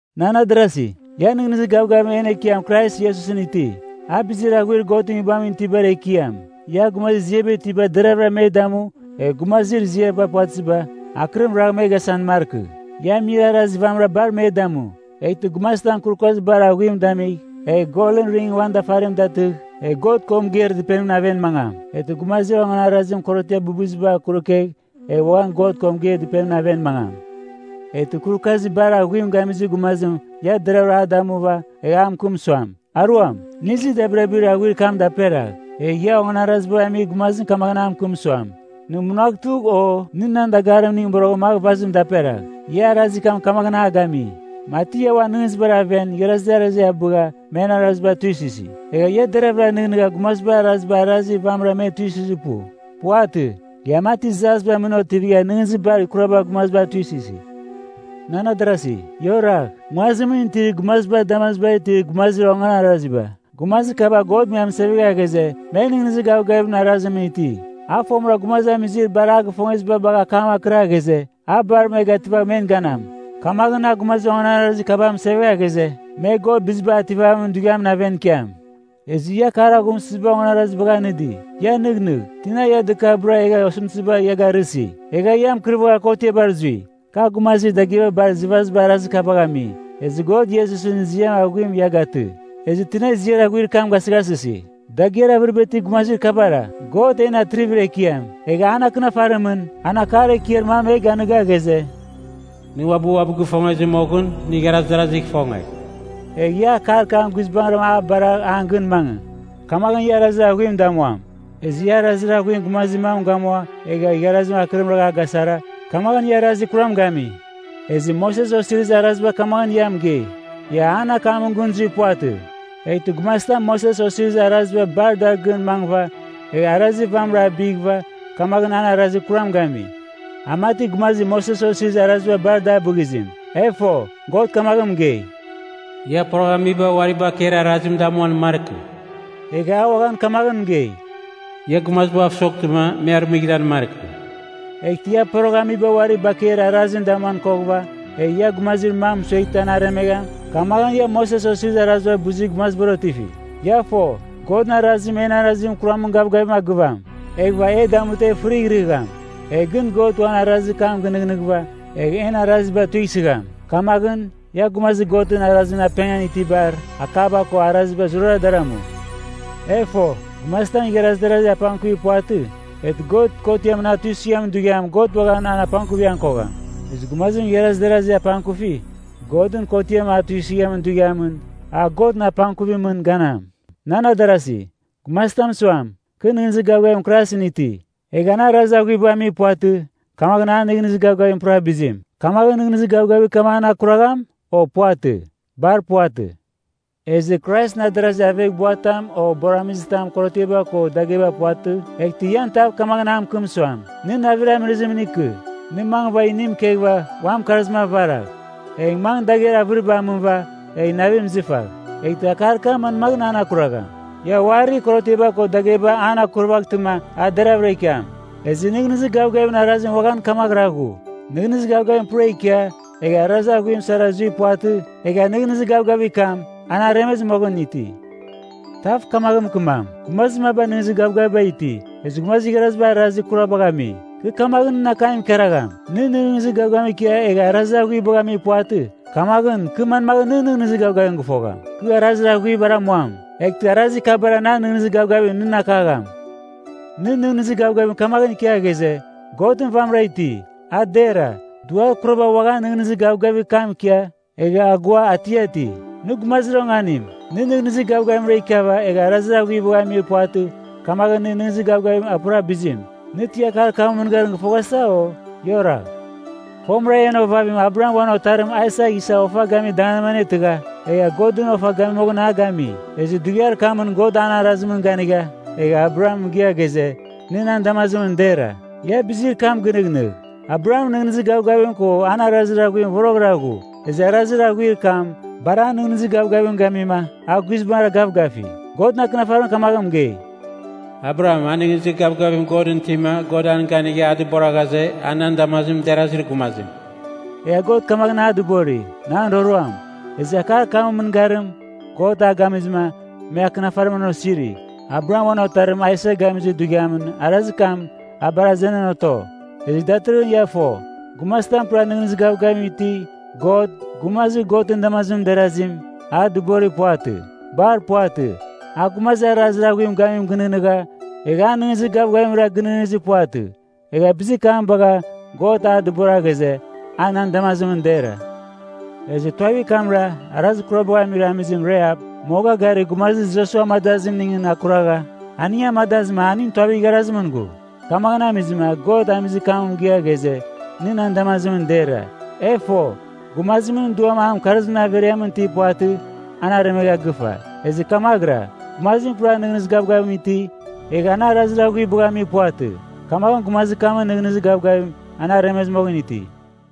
Nan adarasi, ia nɨghnɨzir gavgavim en Ekiam Krais Iesusɨn iti, a bizir aghuir Godɨn Nguibamɨn itibar Ekiam. Ia gumazir ziaba itiba deravɨra me damu egh gumazir ziaba puvatɨziba akɨrim ragh me gasan markɨ. Ia amir arazir vamɨran bar me damu. Eghtɨ gumazitam kurukazir bar aghuim damigh, egh golɨn ring uan dafarim datɨgh, egh God ko mɨgeir dɨpenimɨn aven mangam, eghtɨ gumazir onganarazim korotiar bɨbɨzibar kurukegh egh uaghan God ko mɨgeir dɨpenimɨn aven mangam, eghtɨ kurukazir bar aghuim gamizir gumazim ia deravɨra a damuva, egh a mɨkɨm suam, “Aruam, nɨ izɨ dabirabir aghuir kam daperagh,” egh ia onganarazibagh amir gumazim kamaghɨn a mɨkɨm suam, “Nɨ munagh tugh,” o “Nɨ nan dagarimning boroghɨn magh vazim daperagh,” ia arazir kam kamaghɨn a gami. Mati ia uan nɨghnɨzibar aven igharazi darazi abɨgha men araziba tuisɨsi. Egha ia deravɨra nɨghnɨgha gumazibar araziba arazir vamɨran me tuisɨzir pu. Puvatɨ. Ia mati jasbar mɨn otivigha nɨghnɨzir bar kurabar gumaziba tuisɨsi. Nan adarasi, ia oragh. Nguazimɨn itir gumazibar damazibar itir gumazir onganaraziba, gumazir kaba God me amɨsevegha ghaze, me nɨghnɨzir gavgavimɨn arazimɨn iti. A fomɨra gumazamizir bar a gifongeziba bagha akam akɨra ghaze, a bar me gativagh men ganam. Kamaghɨn a gumazir onganarazir kaba mɨsevegha ghaze, me God Bizibagh Ativamin Dughiamɨn aven ikiam. Ezɨ ia akar aghumsɨziba onganarazibagh anɨdi. Ia nɨghnɨgh! Tina ia dɨkabɨra egha osɨmtɨziba ia garɨsi, egha ia mɨkɨrvagha kotiabar zui? Kar gumazir dagɨaba bar izɨvaziba arazir kabagh ami. Ezɨ God Iesusɨn ziar aghuim ia gatɨ, ezɨ tina ziar aghuir kam gasɨghasɨsi? Dagɨar avɨriba itir gumazir kabara. God en atrivir ekiam, egha an Akɨnafarimɨn an akar ekiar mam e ganiga ghaze, “Nɨ uabɨ uabɨ gifongezɨ moghɨn, nɨ igharaz darazigh ifongegh.” Egh ia akar kam guizbangɨra a baragh an gɨn mangɨ, kamaghɨn ia arazir aghuim damuam. Ezɨ ia arazir aghuim gumazir mam gamua egha igharazim akɨrim a gasara, kamaghɨn ia arazir kuram gami. Ezɨ Moses Osirizir Araziba kamaghɨn ia mɨgei, ia an akamɨn gɨn zuir puvatɨ. Eghtɨ gumazitam Moses Osirizir Araziba bar dar gɨn mangɨva, egh arazir vamɨra abighɨva, kamaghɨn an arazir kuram gami. A mati gumazir Moses Osirizir Araziba bar da bɨghizim. E fo, God kamaghɨn mɨgei, “Ia poroghamiba uari bakeir arazim damuan markɨ.” Egha a uaghan kamaghɨn mɨgei, “Ia gumazibav soghtɨma me arɨmɨghɨran markɨ.” Eghtɨ ia poroghamiba uari bakeir arazim damuan koghɨva, egh ia gumazir mam mɨsueghtɨ an aremegham, kamaghɨn ia Moses Osirizir Araziba abɨzir gumazibar otifi. Ia fo, Godɨn arazim en arazir kuramɨn gavgavim a gɨvagham, eghɨva e damutɨ e fɨrighrɨgham. Egh gɨn God uan arazir kam gɨnɨghnɨghɨva egh en araziba tuisɨgham. Kamaghɨn, ia gumazir Godɨn Arazimɨn apengan itibar akaba ko araziba zurara dar amu. E fo, gumazitam igharaz darazir apangkuvir puvatɨ, eghtɨ God kotiamɨn a tuisɨghamin dughiamɨn God uaghan an apangkuvighan kogham. Ezɨ gumazim igharaz darazir apangkufi, Godɨn kotiamɨn a tuisɨghamin dughiamɨn a Godɨn apangkuvimɨn ganam. Nan adarasi, gumazitam suam, “Kɨ nɨghnɨzir gavgavim Kraisɨn iti,” egha an arazir aghuibagh amir puvatɨ, kamaghɨn an nɨghnɨzir gavgavim pura bizim. Kamaghɨn nɨghnɨzir gavgavir kam an akuragham, o puvatɨ? Bar puvatɨ. Ezɨ Kraisɨn adarazir aveghbuatam o buaramizitam, korotiaba ko dagheba puvatɨ, eghtɨ ian tav kamaghɨn a mɨkɨm suam, “Nɨ navir amɨrɨzimɨn ikɨ. Nɨ mangɨva inim ikeghɨva uan mɨkarzim avaragh. Egh mangɨ dagher avɨribar amɨva egh navim izɨfagh.” Eghtɨ akar kam manmaghɨn an akuragham? Ia uari korotiaba ko dagheba an akurvaghtɨma a deravɨra ikiam. Ezɨ nɨghnɨzir gavgavimɨn arazim uaghan kamaghɨra ghu. Nɨghnɨzir gavgavim pura ikia, egha arazir aghuiba sara zuir puvatɨ, egha nɨghnɨzir gavgavir kam, an aremezɨ moghɨn iti. Tav kamaghɨn mɨkɨmam, “Gumazir maba nɨghnɨzir gavgaviba iti, ezɨ gumazir igharaziba arazir aghuibagh ami.” Kɨ kamaghɨn nɨn akam ikaragham, “Nɨ nɨghnɨzir gavgavim ikia egha arazir aghuibagh amir puvatɨ, kamaghɨn kɨ manmaghɨn nɨn nɨghnɨzir gavgavim gɨfogham? Kɨ arazir aghuibar amuam, eghtɨ arazir kabara nan nɨghnɨzir gavgavim nɨn akagham.” Nɨ nɨghnɨzir gavgavim kamaghɨn ikia ghaze, “Godɨn vamɨra iti.” A dera. Duar kuraba uaghan nɨghnɨzir gavgavir kam ikia, egha agoa atiati. Nɨ gumazir onganim! Nɨ nɨghnɨzir gavgavimra ikiava egha arazir aghuibagh amir puvatɨ, kamaghɨn nɨn nɨghnɨzir gavgavim a pura bizim. Nɨ ti akar kamɨn mɨngarim gɨfoghasa, o? Ia oragh. Fomɨra en ovavim Abraham uan otarim Aisak isa ofa gamir danganimɨn anetɨgha egha Godɨn ofa gami moghɨn a gami. Ezɨ dughiar kamɨn God an arazimɨn ganigha egha Abraham mɨgɨa ghaze, nɨ nan damazimɨn dera. Ia bizir kam gɨnɨghnɨgh. Abrahamɨn nɨghnɨzir gavgavim ko an arazir aghuim voroghɨra ghu. Ezɨ arazir aghuir kam bar an nɨghnɨzir gavgavim gamima a guizbangɨra gavgafi. Godɨn Akɨnafarim kamaghɨn mɨgei, “Abraham, a nɨghnɨzir gavgavim Godɨn itima, God an ganigha a dɨbora ghaze, a nan damazimɨn derazir gumazim.” Egha God kamaghɨn a dɨbori, “Nan roroam.” Ezɨ akar kamɨn mɨngarim, God a gamizɨma me Akɨnafarimɨn an osiri, Abraham uan otarim Aisak gamizir dughiamɨn arazir kam, a bar azenan oto. Ezɨ datɨrɨghɨn ia fo, gumazitam pura nɨghnɨzir gavgavim iti, God, “gumazir Godɨn damazimɨn derazim” a dɨborir puvatɨ. Bar puvatɨ. A gumazir arazir aghuim gamim gɨnɨghnɨgha, egha an nɨghnɨzir gavgavimra gɨnɨghnɨzir puvatɨ, egha bizir kam bagha God a dɨbora ghaze, a nan damazimɨn dera. Ezɨ tuavir kamra, arazir kurabagh amir amizim Rahap, moga garir gumazir Josua amadazimningɨn akuragha aning amadazɨma aning tuavir igharazimɨn ghu. Kamaghɨn amizɨma God amizir kam mɨgɨa ghaze, nɨ nan damazimɨn dera. E fo, gumazimɨn duam an mɨkarzimɨn averiamɨn itir puvatɨ, an aremegha gɨfa. Ezɨ kamaghɨra, gumazim pura nɨghnɨzir gavgavim iti, egha an arazir aghuibagh amir puvatɨ, kamaghɨn gumazir kamɨn nɨghnɨzir gavgavim an aremezɨ moghɨn iti.